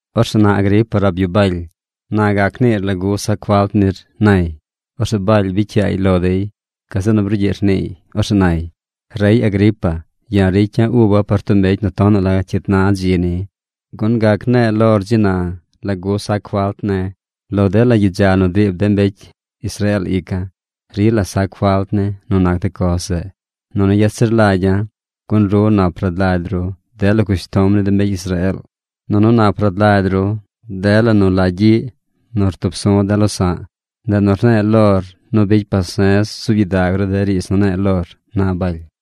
Orzeꞌ na Agripa rab yu Baly: ―Na gac niir lagu sac falt nir ―nay. Orzeꞌ Baly bicy yaay lo dey. Gazeꞌ nu brugyiꞌ rniiy. Orzeꞌ nay: ―Rey Agripa, ya̱ ricya̱ uba̱ par tub mbecy nu tonaꞌ la cyit na dzi ni, gun gac ne̱e̱ lor dzi na lagu sac falt ne̱. Lo dela gyidza nu driib de mbecy Israeel ica̱, rila sac falt ne̱ nu nac de coz zeꞌ. Nunu yet zir lagya̱, gun ru nap rad lagy ru dela cushtom ni de mbecy Israeel, nunu nap rad lagy ru dela nu la gyiꞌ nu rtub su̱ de̱ losa̱ꞌ. Ndeꞌ nu rne̱e̱ lor nu bicy pase̱z zuub gyidag ru de riidz nu ne̱e̱ lor ―na Baly―.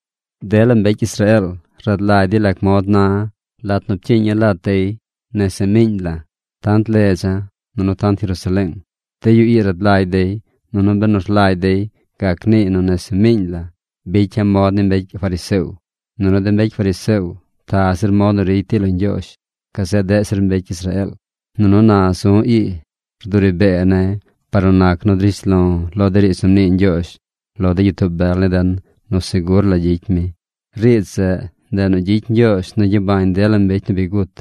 ’Dela mbecy Israeel rad lagy dey lac mod na̱ lat nu pcyiiña̱ lat dey nese miiñ la̱: tant ledza̱, nunu tant Jerusaleeng. De yu ii rad lagy dey, nunu benu rlagy dey, gac niiy nu nese miiñ la̱ bicya̱ mod ni mbecy fariseo. Nunu de mbecy fariseo ta zir mod nu ricy dey lo Ñgyoozh gazeꞌ deꞌ zir mbecy Israeel. Nunu na zu̱ ii rduri bee ne̱ par nu nac nu drish lo̱ lo de riidz nu mnii Ñgyoozh lo de gyitoo bel ni den nu segur la gyicy mi. Riidz zeꞌ ndeꞌ nu gyicy Ñgyoozh nu gyabañ dela mbecy nu bi gut.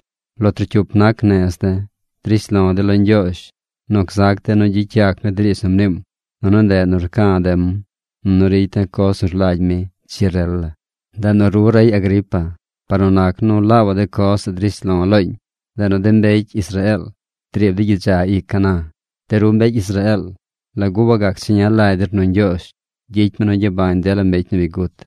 Lo trocyup nac nez de̱ drish lo̱ de̱ lo Ñgyoozh nu gzac de̱ nu gyicy yac mi de riidz nu mniim. Nunu ndeꞌ nu rca̱ de̱m, nunu ricy de̱ coz nu rlagy mi dzi rel la. Ndeꞌ nu ru rey Agripa par nu nac nu laabaꞌ de coz zeꞌ drish lo̱ looñ, ndeꞌ nu de mbecy Israeel driib dey gyidza ica̱ na. De ru mbecy Israeel ¿lagu wagac cheña lagy der nu Ñgyoozh gyicy mi nu gyabañ dela mbecy nu bi gut?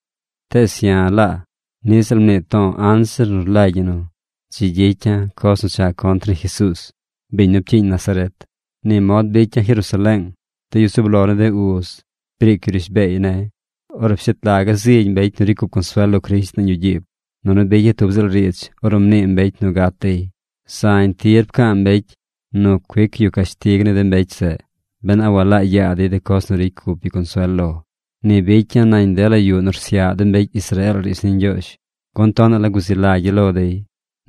’Tees ya̱ laa niꞌ ziꞌl mnii to̱o̱ anzir nu rlagy ñi nu dzi gyicya̱ coz nu cha contr ni Jesuuz, biñ nu pcyiiñ Nazaret. Ni mod bicya̱ Jerusaleeng. De yu zub lo ni de uz briic yu rishbeey ne̱. Orzeꞌ pshet laga̱ zigy mbecy nu ricy cup consuel lo Crisht nañ yuꞌ gyiib, nunu bicya̱ tub ziꞌl riidz ornu mnii mbecy nu gat dey. Zañ tir pca̱a̱ mbecy nu cuic yu cashtig ni de mbecy zeꞌ ben a walaa yaa dey de coz nu ricy cup yu consuel lo. Ni bicya̱ nañ dela yuꞌ nu rsyaꞌ de mbecy Israeel riidz ni Ñgyoozh, gun tonaꞌ la guzi lagya̱ lo dey.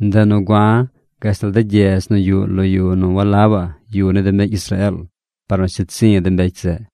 Ndeꞌ nu gua̱ gashtal de gyedz nu yuꞌ lo yu nu walabaꞌ yu ni de mbecy Israeel par nu sheed zi̱ de mbecy zeꞌ.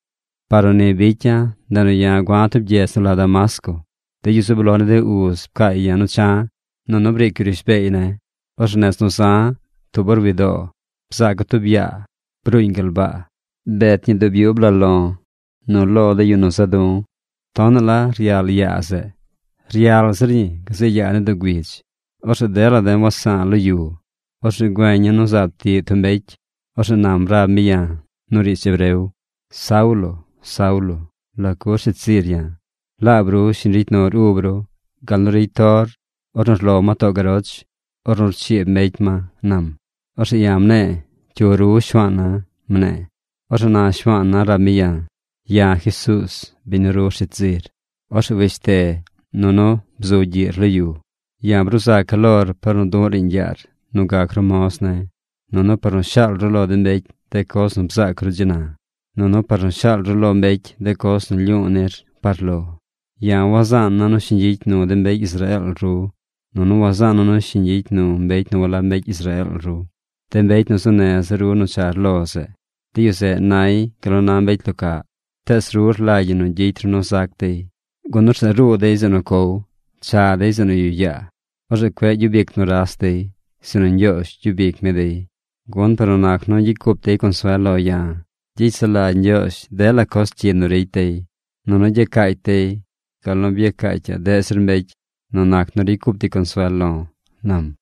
’Par nu ni bicya̱, ndeꞌ nu ya̱ gua̱ tub gyedz nu la Damasco. De yu zub lo ni de uz pcaay ya̱ nu cha̱, nunu briic yu rishbeey ne̱. Orzeꞌ nez nu za̱, tub or wi doo, bzaaca̱ tub yaa. Bruuñ gal baa. Bet ñi dub yub la lo̱ nu lo de yu nu za̱ du̱. Tonaꞌ la ryal yaa zeꞌ. Ryal zir ñi gazeꞌ yaa ni doo güidz. Orzeꞌ dela de̱ wes sa̱a̱ lo yu. Orzeꞌ güeñ ya̱ nu zaab tiꞌ tub mbecy. Orzeꞌ nam rab mi ya̱ nu riidz hebreo: “Saulo, Saulo, ¿lagu rsheed zir ya̱? Laab ru shiñ ricy nur ub ru gal nu ricy tor, ornu rlo ma too garoch, ornu rchiib mbecy ma”, nam. Orzeꞌ ya̱ mne̱e̱: “¿Cyu ru Shuaana̱?” mne̱e̱. Orzeꞌ na Shuaana̱ rab mi ya̱: “Ya̱ Jesuuz, biñ nu ru rsheed zir. Orzeꞌ weshte, nunu bzu gyiꞌr lo yu. Ya̱ bruu zaca̱ lor par nu du̱ꞌ riiñ yaar nu gac ru moz ne̱, nunu par nu shaal ru lo de mbecy de coz nu bzaac ru dzi na, nunu par nu shaal ru lo mbecy de coz nu lyu̱u̱ nir par lo. Ya̱ wazaana̱ nu shiñ gyicy nu de mbecy Israeel ru, nunu wazaana̱ nu shiñ gyicy nu mbecy nu walab mbecy Israeel ru, de mbecy nu zuu neza̱ ru nu char lo zeꞌ. De yu zeꞌ nay gal nu na mbecy lo caꞌ. Tees ru rlagy ñi nu gyicy ru nu zac dey. Gun orzeꞌ ruu dey zeꞌ nu cow. Cha dey zeꞌ nu yuꞌ yaa. Orzeꞌ cueꞌ gyub ic nuras dey, sinu Ñgyoozh gyub ic mi dey. Gun par nu nac nu gyicy cup dey consuel lo̱ ya̱, gyicy sulagy Ñgyoozh dela coz cyi nu ricy dey. Nunu gyacaacy dey gal nu byacaacyaꞌ deꞌ zir mbecy nu nac nu ricy cup dey consuel lo̱”, nam.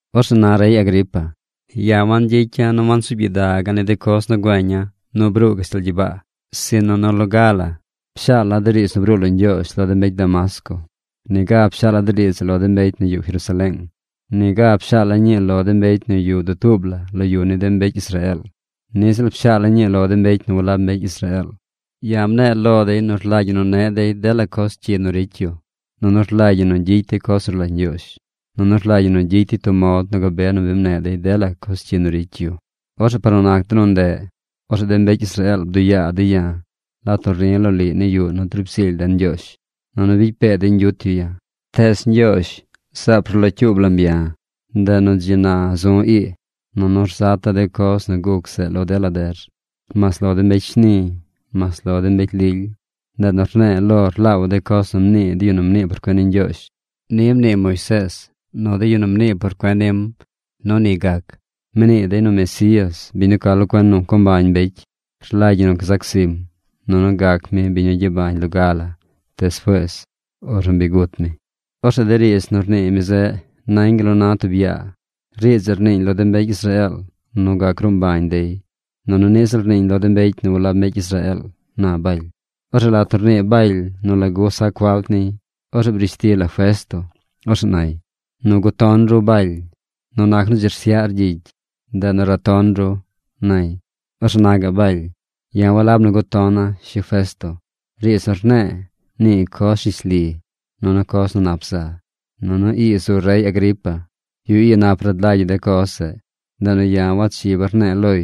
’Orzeꞌ na rey Agripa, ya̱ wangyicya̱ nu wansuub gyidaga̱ ni de coz nu güeña̱ nu bruu gashtal gyibaa. Sinu nu loga la pshaala̱ de riidz nu bruu lo Ñgyoozh lo de mbecy Damasco. Niga pshaala̱ de riidz zeꞌ lo de mbecy nu yuꞌ Jerusaleeng. Niga pshaala̱ ñii lo de mbecy nu yuꞌ dutuub la lo yu ni de mbecy Israeel. Niꞌ ziꞌl pshaala̱ ñii lo de mbecy nu walab mbecy Israeel. Ya̱ mne̱e̱ lo dey nu rlagy ñi nu neꞌ dey dela coz cyi nu ricy yu, nunu rlagy ñi nu gyicy dey coz nu rlagy Ñgyoozh, nunu rlagy ñi nu gyicy dey tub mod nu gabe nu bi mneꞌ dey dela coz cyi nu ricy yu. Orzeꞌ par nu nac de nu ndeꞌ, orzeꞌ de mbecy Israeel bduꞌ yaa dey ya̱ lat nu ri̱ loliꞌ ni yuꞌ nu driib zily den Ñgyoozh, nunu bicy pee dey ñgyut yu ya̱. Tees Ñgyoozh zaab rlocyuub lam ya̱. Ndeꞌ nu dzi na zu̱ ii, nunu rzata̱ de coz nu guc zeꞌ lo dela der: mas lo de mbecy shni, mas lo de mbecy lily. Ndeꞌ nu rne̱e̱ lor laabaꞌ de coz nu mnii de yu nu mnii por cuen ni Ñgyoozh. Ni mnii Moisees nu de yu nu mnii por cuen nim nu ni gac. Mnii dey nu Mesías, biñ nu ca lo cuen nu co mbañ mbecy, rlagy ñi nu gzac zim, nunu gac mi biñ nu gyabañ loga la despuees ornu bi gut mi. Orzeꞌ de riidz nu rnii mi zeꞌ nañ gal nu na tub yaa. Riidz zeꞌ rniiñ lo de mbecy Israeel nu gac gruu mbañ dey, nunu niꞌ ziꞌl rniiñ lo de mbecy nu walab mbecy Israeel ―na Baly. Orzeꞌ lat nu rnii Baly nu lagu sac falt niy, orzeꞌ brish ti la Festo. Orzeꞌ nay: ―¡Nu guton ru Baly, nu nac nu dzi rsyaꞌr gyicy, ndeꞌ nu raton ru! ―nay. Orzeꞌ na gaꞌ Baly: ―Ya̱ walab nu gutona̱ Shi Festo. Riidz nu rne̱e̱, nii coz rishli nunu coz nu nap za. Nunu ii zu rey Agripa. Yu ii nap rad lagy yu de coz zeꞌ. Ndeꞌ nu ya̱ wachiba̱ rne̱e̱ loy,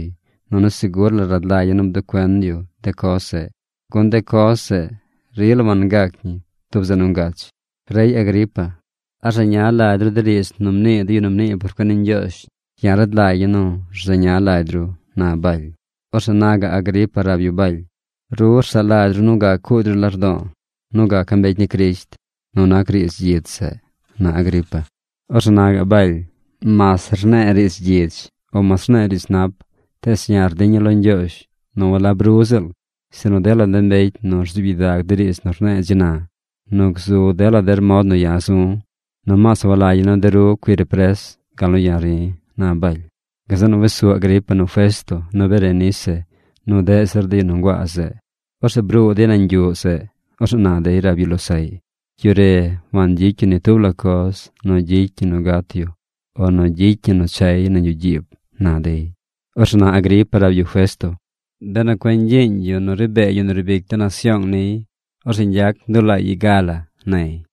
nunu segur la rad lagya̱ nu bduꞌ cuen yu de coz zeꞌ, gun de coz zeꞌ rila wangac ñi tub zeꞌ nu ngach. Rey Agripa, ¿a rzeña lagy ru de riidz nu mnii de yu nu mnii por cuen ni Ñgyoozh? Ya̱ rad lagya̱ nu ru rzeña lagy ru ―na Baly. Orzeꞌ na gaꞌ Agripa rab yu Baly: ―Ru rsaꞌ lagy ru nu gac cuugy ru lardo̱o̱ nu gaca̱ mbecy ni Crisht nu nac riidz gyidz zeꞌ ―na Agripa. Orzeꞌ naꞌ Baly: ―Mas rne̱e̱ riidz gyidz o mas rne̱e̱ riidz nap tees ya̱ rdiña̱ lo Ñgyoozh nu walab ru ziꞌl, sinu dela de mbecy nu rzuub gyidag de riidz nu rne̱e̱ dzi na, nu gzu dela der mod nu ya̱ zu̱, nomaas walagya̱ nu de ru cuir pres gal nu ya̱ ri̱ ―na Baly. Gazeꞌ nu wes su Agripa nu Festo nu Berenice nu deꞌ zir de yu nu nguaa zeꞌ. Orzeꞌ bruu dey nañ yuꞌ zeꞌ. Orzeꞌ na dey rab yu losaꞌy: ―Yu re wangyicy yu ni tub la coz nu gyicy ñi nu gat yu o nu gyicy ñi nu chay nañ yuꞌ gyiib ―na dey. Orzeꞌ na Agripa rab yu Festo: ―Benu cueꞌ ñgyiiñ yu nu ri bee yu nu riib ic de nasyoong niy, orzeꞌ ñgyac ndulaay i ga la ―nay.